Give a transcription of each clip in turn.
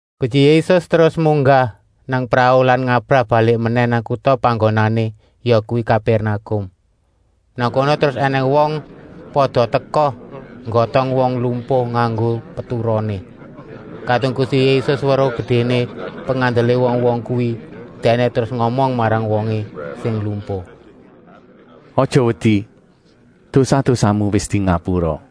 Gusti Yésus terus munggah nang prau lan ngabrah balik menèh nang kuta panggonané, yakuwi Kapèrnakum. Nang kono terus ènèng wong pada teka nggotong wong lumpuh nganggo peturoné. Kadung Gusti Yésus weruh gedéné pengandelé wong-wong kuwi, Dèkné terus ngomong marang wongé sing lumpuh: “Aja wedi, dosa-dosamu wis dingapura.”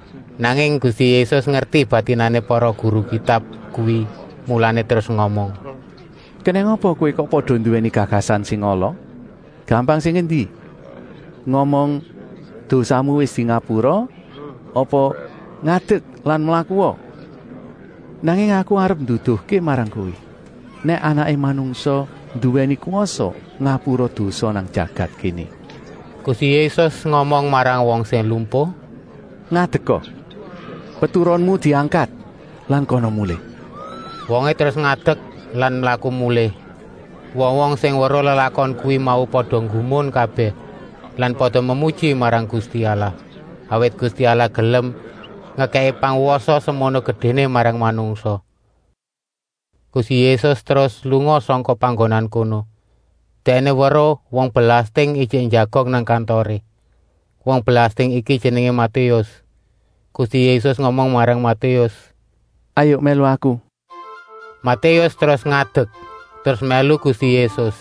Nanging Gusti Yésus ngerti batinané para guru Kitab kuwi, mulané terus ngomong: “Kenèng apa kowé kok pada nduwèni gagasan sing ala? Gampang sing endi, ngomong: ‘Dosamu wis dingapura,’ apa: ‘Ngadek lan mlakua?’ Nanging Aku arep nduduhké marang kowé, nèk Anaké Manungsa nduwèni kwasa ngapura dosa nang jagat kéné.” Gusti Yésus ngomong marang wong sing lumpuh: “Ngadeka! Peturonmu diangkat lan kana mulih.” Wongé terus ngadek lan mlaku mulih. Wong-wong sing weruh lelakon kuwi mau pada nggumun kabèh lan pada memuji marang Gusti Allah, awit Gusti Allah gelem ngekèki pangwasa semono gedéné marang manungsa. Gusti Yésus terus lunga sangka panggonan kono. Dèkné weruh wong belasting ijik njagong nang kantoré. Wong belasting iki jenengé Matéus. Gusti Yésus ngomong marang Matéus: “Hayuk mèlu Aku!” Matéus terus ngadek, terus mèlu Gusti Yésus.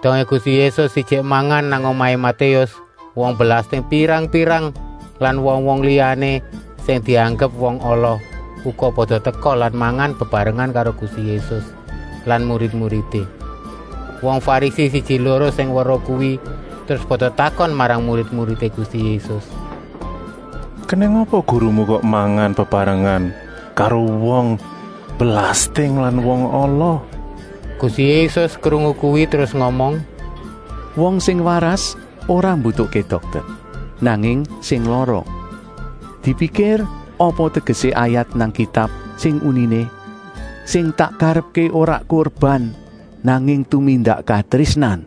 Dongé Gusti Yésus ijik mangan nang omahé Matéus, wong belasting pirang-pirang lan wong-wong liyané sing dianggep wong ala, uga pada teka lan mangan bebarengan karo Gusti Yésus lan murid-muridé. Wong Farisi siji-loro sing weruh kuwi terus pada takon marang murid-muridé Gusti Yésus: “Kenèng apa gurumu kok mangan bebarengan karo wong belasting lan wong ala?” Gusti Yésus krungu kuwi terus ngomong: “Wong sing waras ora mbutuhké dokter, nanging sing lara. Dipikir apa tegesé ayat nang Kitab sing uniné: ‘Sing tak karepké ora kurban, nanging tumindak katrésnan!’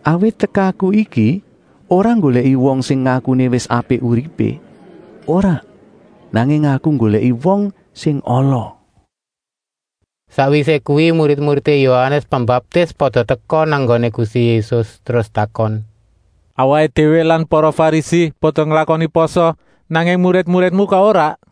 Awit tekaku iki ora nggolèki wong sing ngakuné wis apik uripé, ora, nanging Aku nggolèki wong sing ala.” Sakwisé kuwi murid-muridé Yohanes Pembaptis pada teka nang nggoné Gusti Yésus, terus takon: “Awaké déwé lan para Farisi pada nglakoni pasa, nanging murid-muridmu kok ora?”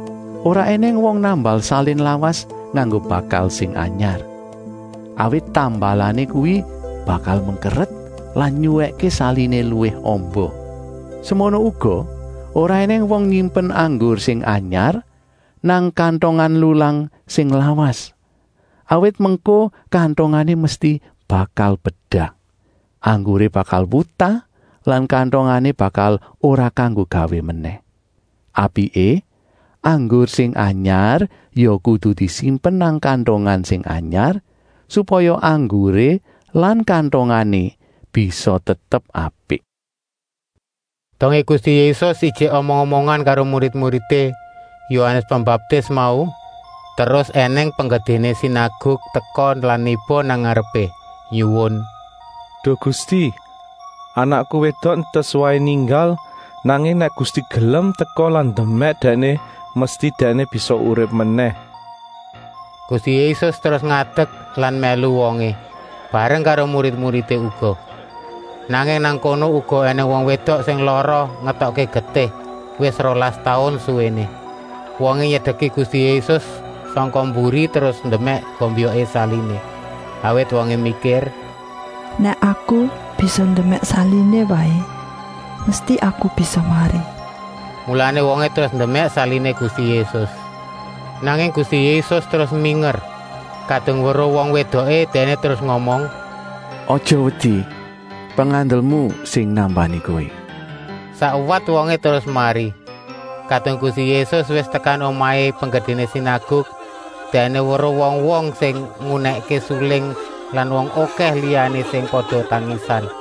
“Ora ènèng wong nambal salin lawas nganggo bakal sing anyar. Awit tambalané kuwi bakal mengkeret lan nyuwèkké saliné luwih amba. Semono uga ora ènèng wong nyimpen anggur sing anyar nang kantongan lulang sing lawas, awit mengko kantongané mesti bakal bedah. Angguré bakal wutah lan kantongané bakal ora kanggo gawé menèh. Apiké, anggur sing anyar ya kudu disimpen nang kantongan sing anyar, supaya angguré lan kantongané bisa tetep apik.” Dongé Gusti Yésus ijik omong-omongan karo murid-muridé Yohanes Pembaptis mau, terus ènèng penggedéné sinaguk teka lan niba nang ngarepé, nyuwun: “Duh Gusti, anakku wédok entas waé ninggal, nanging nèk Gusti gelem teka lan ndemèk dèkné, mesti dèkné bisa urip menèh.” Gusti Yésus terus ngadek lan mèlu wongé, bareng karo murid-muridé uga. Nanging nang kono uga ènèng wong wédok sing lara ngetokké getih, wis rolas taun suwéné. Wongé nyedeki Gusti Yésus sangka mburi terus ndemèk gombyoké saliné. Awit wongé mikir: “Nèk aku bisa ndemèk saliné waé, mesti aku bisa mari.” Mulané wongé terus ndemèk saliné Gusti Yésus. Nanging Gusti Yésus terus minger. Kadung weruh wong wédoké, Dèkné terus ngomong: “Aja wedi, pengandelmu sing nambani kowé.” Sakwat wongé terus mari. Kadung Gusti Yésus wis tekan omahé penggedéné sinaguk, Dèkné weruh wong-wong sing ngunèkké suling lan wong okèh liyané sing pada tangisan.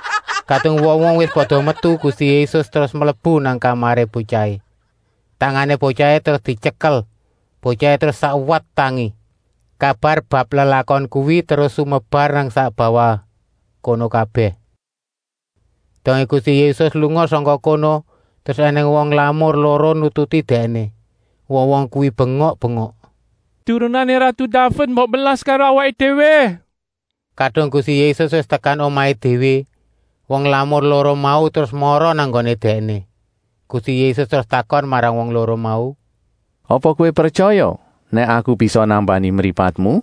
Kadung wong-wong wis pada metu, Gusti Yésus terus mlebu nang kamaré botyahé. Tangané botyahé terus dityekel, botyahé terus sakwat tangi. Kabar bab lelakon kuwi terus sumebar nang sak bawah kono kabèh. Dongé Gusti Yésus lunga sangka kono, terus ènèng wong lamur loro nututi Dèkné. Wong-wong kuwi bengok-bengok: “Turunané ratu Daved, mbok melas karo awaké déwé!” Kadung Gusti Yésus wis tekan omahé déwé, wong lamur loro mau terus mara nang nggoné Dèkné. Gusti Yésus terus takon marang wong loro mau: “Apa kowé pretyaya nèk Aku bisa nambani mripatmu?”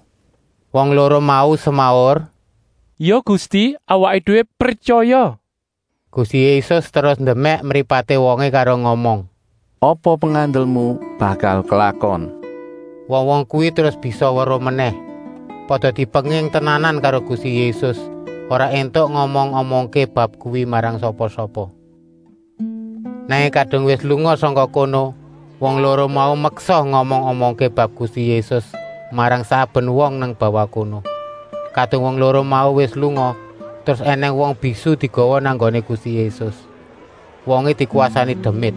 Wong loro mau semaur: “Ya Gusti, awaké déwé pretyaya!” Gusti Yésus terus ndemèk mripaté wongé karo ngomong: “Apa pengandelmu bakal klakon!” Wong-wong kuwi terus bisa weruh menèh. Pada dipenging tenanan karo Gusti Yésus, ora éntuk ngomong-omongké bab kuwi marang sapa-sapa. Nanging kadung wis lunga sangka kono, wong loro mau meksa ngomong-omongké bab Gusti Yésus marang saben wong nang bawah kono. Kadung wong loro mau wis lunga, terus ènèng wong bisu digawa nang nggoné Gusti Yésus. Wongé dikwasani demit.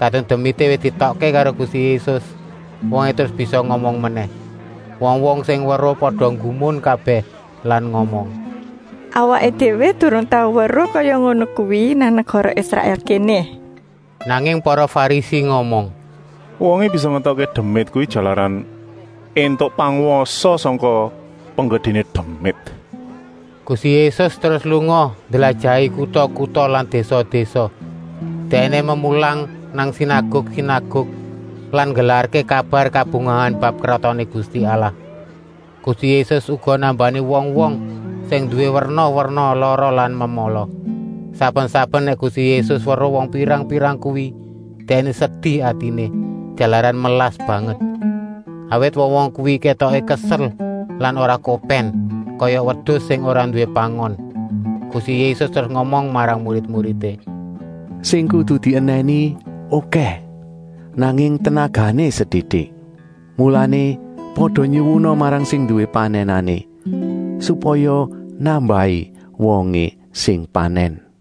Kadung demité wis dietokké karo Gusti Yésus, wongé terus bisa ngomong menèh. Wong-wong sing weruh pada nggumun kabèh lan ngomong: “Awaké déwé durung tau weruh kaya ngono kuwi nang negara Israèl kéné.” Nanging para Farisi ngomong: “Wongé bisa ngetokké demit kuwi jalaran éntuk pangwasa sangka penggedéné demit.” Gusti Yésus terus lunga ndlajahi kuta-kuta lan désa-désa. Dèkné memulang nang sinaguk-sinaguk lan nggelarké kabar kabungahan bab Kratoné Gusti Allah. Gusti Yésus uga nambani wong-wong sing nduwé werna-werna lara lan memala. Saben-saben nèk Gusti Yésus weruh wong pirang-pirang kuwi, Dèkné sedi atiné, jalaran melas banget. Awit wong-wong kuwi kétoké kesel lan ora kopèn, kaya wedus sing ora nduwé pangon. Gusti Yésus terus ngomong marang murid-muridé: “Sing kudu dienèni okèh, nanging bauné setitik. Mulané pada nyuwuna marang sing nduwé panènané, supaya nambahi wongé sing panèn.”